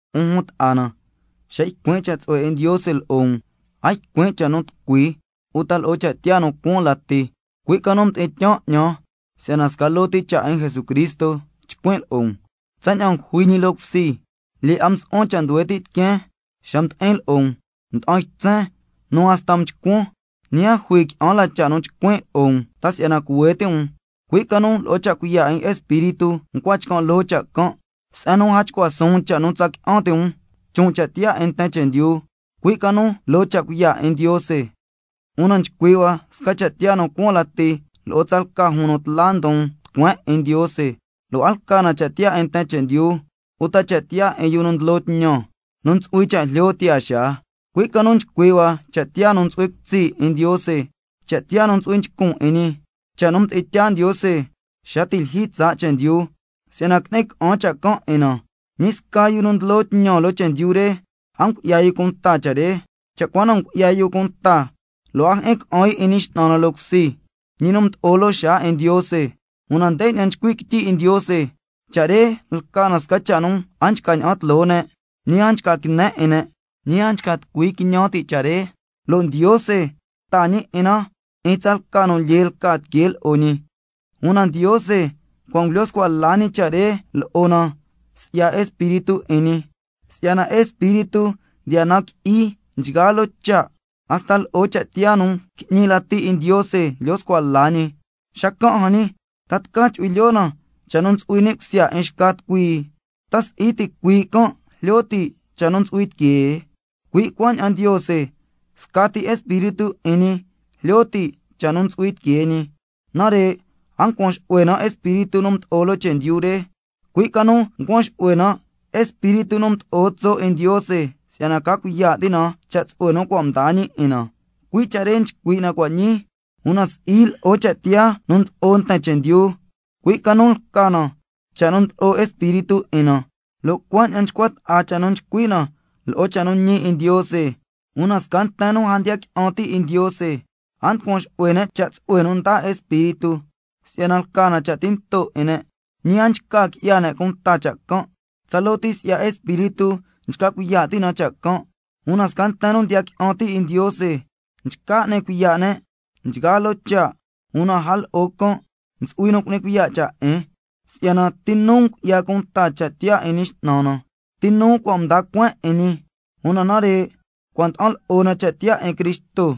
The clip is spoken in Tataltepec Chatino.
'Un jun ta'a na, xa ycuin' cha' tsu'hue 'in Ndiose lo'o um, a ycuin' cha' nu tucui uta lo'o cha' tiyaa nu cuaan lati, cui' ca nu mdi'in tyaan 'ñan si'yana sca loo ti cha' 'in Jesucristo chcuin' lo'o um, si'yana ngujui ñi loo cusi. Lyee 'a msu'huan cha' nduhue ti' tiqueen xa mdi'in lo'o um, nda'an ytsen nu hasta mchcuan. Ñi a jui qui'an la cha' nu chcuin' lo'o um ta si'yana cuhue ti' um, cui' ca nu lo'o cha' cuiya' 'in Espíritu ncua chcan' loo cha' can', se'en nu a chcua suun cha' nu tsa qui'an ti' um chon' cha' tiyaa 'in nten chendyu, cui' ca nu loo cha' cuiya' 'in Ndiose. Una nchcui' hua sca cha' tiyaa nu cuaan lati lo'o tsalca jun nu tla ndon tucueen 'in Ndiose, lo' a lca na cha' tiyaa 'in nten chendyu, uta cha' tiyaa 'in yu nu ndlo tñan, nu ntsu'hui cha' jlyo tiyaa xaa, cui' ca nu nchcui' hua cha' tiyaa nu ntsu'hui cutsi' 'in Ndiose, cha' tiyaa nu ntsu'hui nchcun 'in ñi, cha' nu mdi'in tyaa Ndiose xa ti' lyijyi tsaa' chendyu si'yana qui'ni ca'an cha' can' 'in na. Ñi sca yu nu ndlo tñan loo chendyu re a ngu'ya yu cunta cha' re, cha' cua na ngu'ya yu cunta 'in na, lo' a jyi'in ca'an yu 'in Ñi X'nan na loo cusi, ñi nu mdo'o loo xaa 'in Ndiose. Una ndeña'an nchcui' quityi 'in Ndiose: —Cha' re lca na sca cha' nu a nchca ña'an tloo ne', ñi a nchca quine 'in ne', ñi a nchca tucui quiñan ti' cha' re, lo' Ndiose taa ñi 'in na 'in tsalca nu lyee lca tiquee lo'o ñi—. Una Ndiose cua' ngulyo scua la ñi cha' re lo'o na si'ya Espíritu 'in ñi, si'yana Espíritu ndiya nan qui'i nchgaa loo cha', hasta lo'o cha' tiyaa nu qui'ñi lati 'in Ndiose ndlyo scua la ñi. Xacan' jan ñi, ¿ta tca chu'hui lyoo na cha' nu ntsu'hui ni' cusya 'in xca tucui? ¿Ta si'i ticuii' can' jlyo ti' cha' nu ntsu'hui tiquee? Cui' cuaña'an Ndiose, scati Espíritu 'in ñi jlyo ti' cha' nu ntsu'hui tiquee ñi. Nare' a ncuan xu'hue na espíritu nu mdo'o loo chendyu re, cui' ca nu ncuan xu'hue na Espíritu nu mdo'o tso' 'in Ndiose, si'yana ca cuiya' ti' na cha' tsu'hue nu cua' mdaa ñi 'in na, cui' cha' re nchcui' na cua' ñii, una si'i lo'o cha' tiyaa nu ndlo'o nten chendyu, cui' ca nu lca na cha' nu ndlo'o Espíritu 'in na, lo' cuaña'an nchcua ta'a cha' nu nchcui' na lo'o cha' nu ñi 'in Ndiose. Una sca nten nu a ndiya qui'an ti' 'in Ndiose a nducuan xu'hue ne' cha' tsu'hue nu ndaa Espíritu 'in ñi, si'yana lca na cha' tinto 'in ne', ñi a nchca qui'ya ne' cunta cha' can', si'yana tsaloo ti si'ya Espíritu nchca cuiya' ti' na cha' can'. Una sca nten nu ndiya qui'an ti' 'in Ndiose nchca n'ni cuiya' ne' nchgaa loo cha', una a lo'o can' ntsu'hui nu cu'ni cuiya' cha' 'in, —si'yana, ¿ti nu ngu'ya cunta cha' tiyaa 'in Ñi X'nan na? ¿Ti nu cua' mda cueen 'in ñi—? Una nare' cua' nda'an lo'o na cha' tiyaa 'in Cristo.